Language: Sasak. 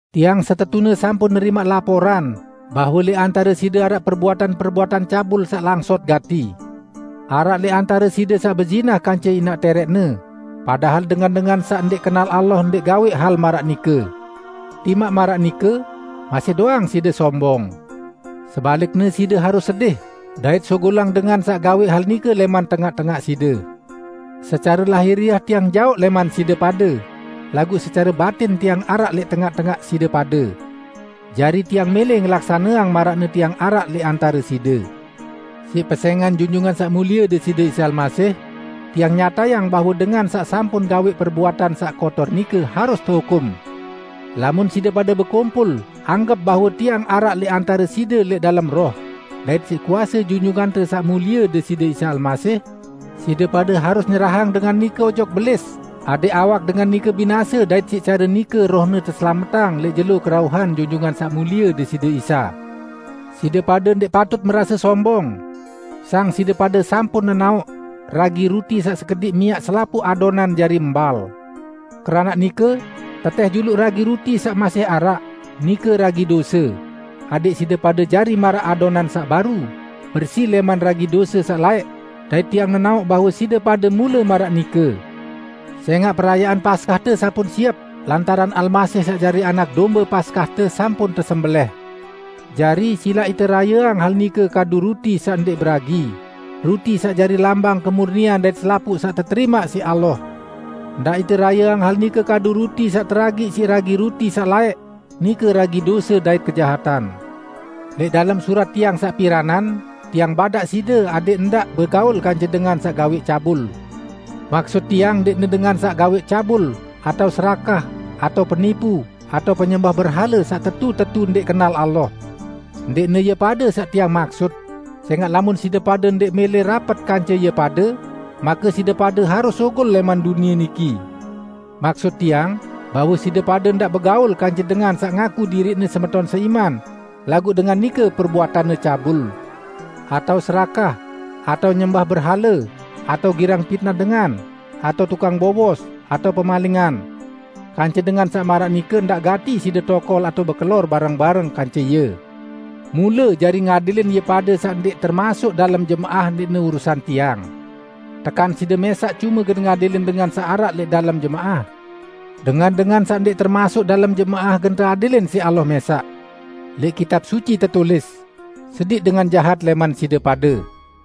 Tiang setetune sampun nerimaq laporan bahwe lẽq antare side araq perbuatan-perbuatan cabul saq langsot gati: Araq lẽq antare side saq bezinah kance inaq tẽrẽqne, padahal dengan-dengan saq ndẽq kenal Allah ndẽq gawẽq hal maraq nike. Timaq maraq nike, masih doang side sombong. Sebalikne side harus sedih, dait sugulang dengan saq gawẽq hal nike lẽman tengaq-tengaq side. Secare lahiriah tiang jaoq lẽman side pade, laguq secare batin tiang araq lẽq tengaq-tengaq side pade. Jari tiang mẽlẽ ngelaksaneang maraqne tiang araq lẽq antare side, "Siq pesẽngan Junjungan Saq Mulie Deside Isa Almasih, tiang nyatayang bahwe dengan saq sampun gawẽq perbuatan saq kotor nike, harus tehukum!" Lamun side pade bekumpul anggep bahwe tiang araq lẽq antare side lẽq dalem roh, dait siq kuase Junjungante Saq Mulie Deside Isa Almasih, side pade harus nyerahang dengan nike ojok Belis adẽq awak dengan nike binase dait siq care nike rohne teselametang lẽq jelo kerauhan Junjungan Saq Mulie Deside Isa. Side pade ndẽq patut merase sombong. Sang side pade sampun nenaoq, "Ragi ruti saq sekediq miaq selapuq adonan jari mbal!" Keranaq nike, tetẽh juluq ragi ruti saq masih araq, nike ragi dose, adẽq side pade jari maraq adonan saq baru, bersi lẽman ragi dose saq laẽq, dait tiang nenaoq bahwe side pade mule maraq nike. Sẽngaq, perayaan Paskahte sampun siep, lantaran Almasih saq jari anak dombe Paskahte, sampun tesembelẽh. Jari, silaq ite rayeang hal nike kadu ruti saq ndẽq beragi, ruti saq jari lambang kemurnian dait selapuq saq teterimaq siq Allah. Ndaq ite rayeang hal nike kadu ruti saq teragiq siq ragi ruti saq laẽq, nike ragi dose dait kejahatan. Lẽq dalem surat tiang saq piranan, tiang badaq side adẽq ndaq begaul kance dengan saq gawẽq cabul. Maksut tiang ndẽqne dengan saq gawẽq cabul, atao serakah, atao penipu atao penyembah berhale saq tetu-tetu ndẽq kenal Allah. Ndẽqne ie pade saq tiang maksut; sẽngaq lamun side pade ndẽq mẽlẽ rapet kance ie pade, make side pade harus sugul lẽman dunie niki. Maksut tiang, bahwe side pade ndaq begaul kance dengan saq ngaku diriqne semeton seiman, laguq dengan nike perbuatanne cabul, atao serakah, atao nyembah berhale, atao girang pitnah dengan, atao tukang bowos, atao pemalingan. Kance dengan saq maraq nike, ndaq gati side tokol atao bekelor bareng-bareng kance ie! Mule jari ngadilin ie pade saq ndẽq termasuk dalem jemaah ndẽqne urusan tiang. Tekan side mẽsaq cume gen ngadilin dengan saq araq lẽq dalem jemaah? Dengan-dengan saq ndẽq termasuk dalem jemaah gen teadilin siq Allah mẽsaq. Lẽq Kitab Suci tetulis, "Sediq dengan jahat lẽman side pade."